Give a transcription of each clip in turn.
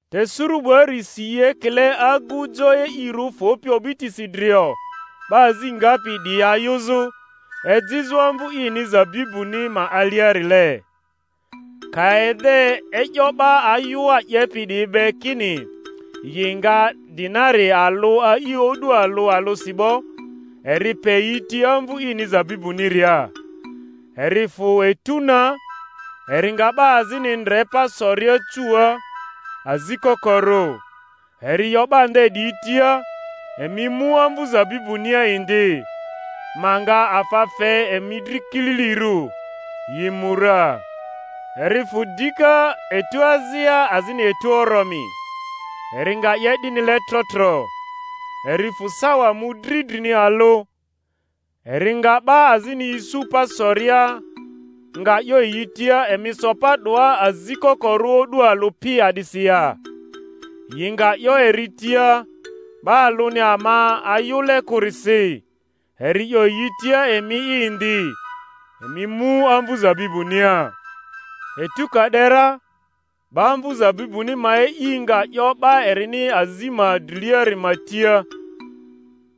Te suru 'buari si i ekile agu jo e'irᴜ fᴜpi o'bitisi drio 'ba azi ngapi 'diyi ayᴜzᴜ, ejizᴜ amvᴜ ini zabibuni ma aliarile. Ka ede e'yo 'ba ayᴜa 'yepi 'diyi be kini yi nga dinari alᴜ a'i o'du alᴜ alᴜsi 'bo, eri pe yi ti amvᴜ ini zabibuniria. Eri fᴜ etu na, eri nga 'ba azini ndre pa soria cuua azi kokorᴜ; eri 'yo 'ba nde 'diyi tia, Emi mu amvᴜ zabibunia indi; ma nga afa fe emi dri kililirᴜ. Yi mu ra. Eri fᴜ dika etu azia azini etu oromi, eri nga 'ye 'dinile tro tro. Eri fᴜ sawa mᴜdri drini alᴜ, eri nga 'ba azini isu pa soria; nga 'yo yi tia, Emi so pa 'doa azi kokorᴜ o'du alᴜ pi a'disi ya? Yi nga 'yo eri tia, 'Ba alᴜni ama ayᴜle kᴜrisi. Eri 'yo yi tia, Emi'i indi, emi mu amvᴜ zabibunia. Etu ka 'de ra, 'ba amvu zabibuni ma e'i nga 'yo 'ba erini azi ma driliari ma tia,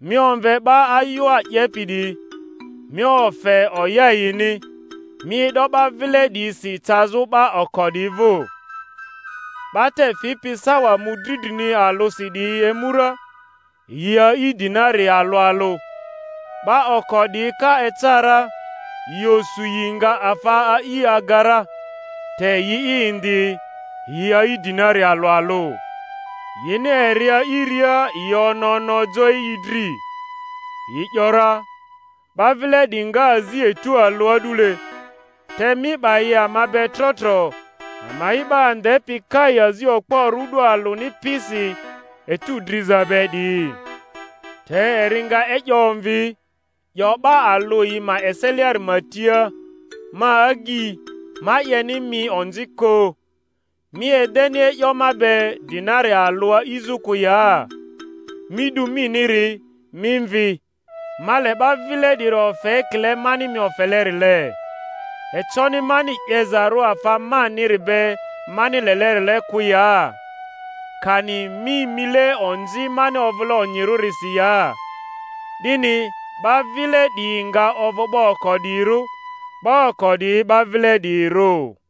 Mi omve 'ba ayᴜa 'yepi 'diyi, mi ofe oya yini, mi e'do 'ba vile 'diyisi cazᴜ 'ba oko 'diyi vᴜ. 'Ba te fipi sawa mᴜdri drini alᴜsi 'diyi emu ra, yi a'i dinari alᴜ alᴜ. 'Ba oko 'diyi ka eca ra, yi osu yi nga afa a'i aga ra; te yi'i indi, yi a'i dinari alᴜ alᴜ. Yini eri a'iria yi ono ono jo e'i dri, yi ‘yora, 'Ba vile 'diyi nga azi etu alᴜ a'dule, te mi 'ba yi ama be tro tro, ama'i 'ba andepi kai azi okporᴜ o'du alᴜni pisi etu driza be 'diyi. Te eri nga e'yo omvi, 'yo 'ba alᴜ yi ma eseliari ma tia, Ma agyi, ma 'yeni mi onzi kᴜ; mi edeni e'yo ma be dinari alᴜ a'izᴜ kᴜ ya? Mi 'du miniri, mi mvi; ma le 'ba vile 'diri ofe ekile mani mi ofelerile. Econi mani 'yezarᴜ afa maniri be mani lelerile kᴜ ya? Kani mi mile onzi mani ovᴜle onyirᴜrisi ya? 'Dini 'ba vile 'diyi nga ovᴜ 'ba oko 'diyirᴜ; 'ba oko 'diyi 'ba vile 'diyirᴜ.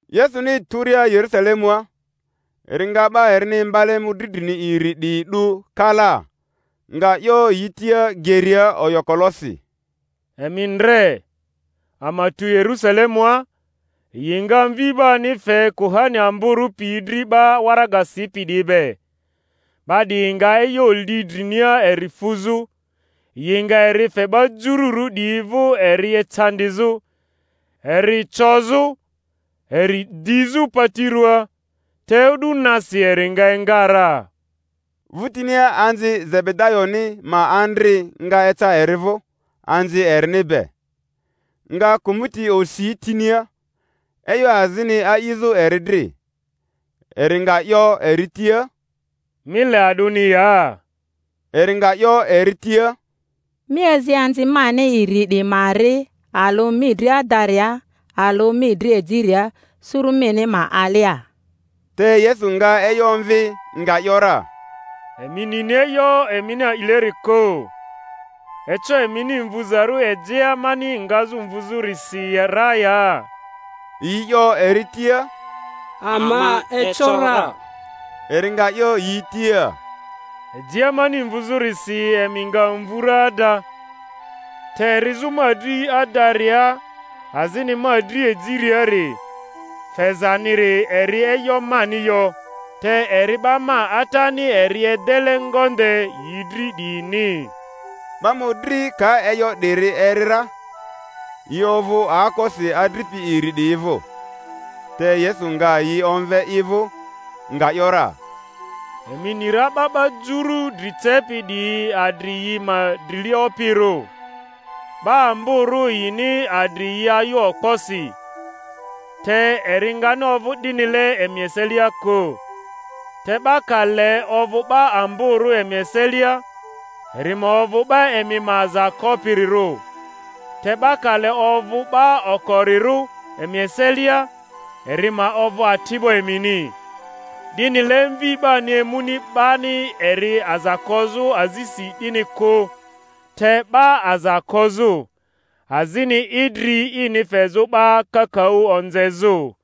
Yesuni turia Yerusalemua, eri nga 'ba erini imbale mᴜdri drini iri 'diyi 'du kalaa, nga 'yo yi tia geria oyokolosi, Emi ndre, ama tu Yerᴜsalemua; yi nga Mvi 'bani fe kuhani amborᴜ piyi dri 'ba waraga sipi 'diyi be, 'ba 'diyi nga e'yo li drinia eri fuzᴜ, yi nga eri fe 'ba jururᴜ 'diyi vᴜ eri ecandizᴜ, eri cozᴜ, eri dizᴜ pati ruaa, te o'du nasi eri nga enga ra. Vᴜtinia anzi Zebedayoni ma andri nga eca eri vᴜ anzi erini be, nga kᴜmᴜti osi tinia, e'yo azini a'izᴜ eri dri. Eri nga 'yo eri tia, Mi le a'dᴜni ya? Eri nga 'yo eri tia, Mi azi anzi mani iri 'diyi ma ri, alᴜ mi dri adaria, alᴜ mi dri ejiria, suru mini ma alia. Te Yesu nga e'yo omvi, nga ‘yora, Emi nini e'yo emini a'ileri kᴜ. Eco emini mvuzarᴜ ejea mani ngazᴜ mvuzᴜrisi ra ya? Yi 'yo eri tia, Ama eco ra. Eri nga 'yo yi tia, Ejea mani mvuzᴜrisi emi nga mvu ra ada; te rizᴜ ma dri adaria azini ma dri ejiriari, fezaniri eri e'yo mani yo, te eri 'ba ma Atani eri edele ngonde yi dri 'diyini. 'Ba mᴜdri ka e'yo 'diri eri ra, yi ovᴜ aokosi adripi iri 'diyi vᴜ. Te Yesu nga yi omve i vᴜ, nga ‘yora, Emi ni ra 'ba 'ba jurᴜ dri cepi 'diyi adri yi ma drilia opirᴜ, 'ba amborᴜ yini adri yi ayᴜ okposi. Te eri ngani ovᴜ 'dinile emi eselia kᴜ; te 'ba ka le ovᴜ 'ba amborᴜ emi eselia, eri ma ovᴜ 'ba emi ma aza kopirirᴜ, te 'ba ka le ovᴜ 'ba okorirᴜ emi eselia, eri ma ovᴜ ati'bo emini; 'dinile Mvi 'bani emuni 'bani eri aza kozᴜ azisi 'dini kᴜ, te 'ba aza kozᴜ, azini idri ini fezᴜ 'ba kakaᴜ onzezᴜ.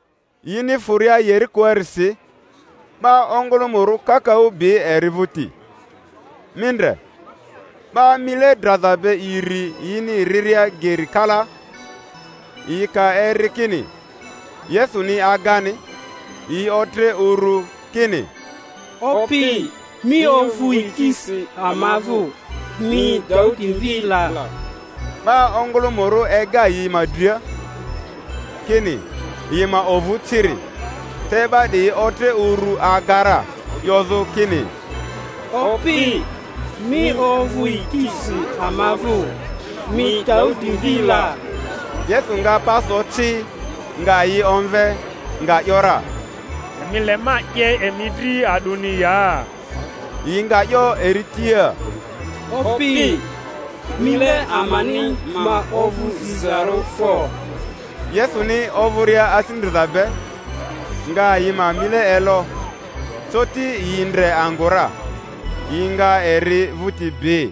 Yini fᴜria Yerikoarisi, 'ba ongᴜlᴜmᴜrᴜ kakaᴜ bi eri vᴜti. Mi ndre, 'ba mile draza be iri yini riria geri kalaa, yi ka eri kini Yesuni agani, yi otre urᴜ kini, Opi, mi ovᴜ yikisi ama vᴜ, mi Daudi mvi la! 'Ba ongᴜlᴜmᴜrᴜ ega yi ma dria, kini yi ma ovᴜ ciri; te 'ba 'diyi otre urᴜ aga ra, 'yozᴜ kini, Opi, mi ovᴜ yikisi ama vᴜ, mi Daudi mvi la! Yesu nga pa so ci, nga yi omve, nga ‘yora, Emi le ma 'ye emi dri a'dᴜni ya? Yi nga 'yo eri tia, Opi, mile amani ma ovᴜ zizarᴜ fo! Yesuni ovᴜria asi ndriza be, nga yi ma mile elo; coti yi ndre angᴜ ra, yi nga eri vᴜti bi.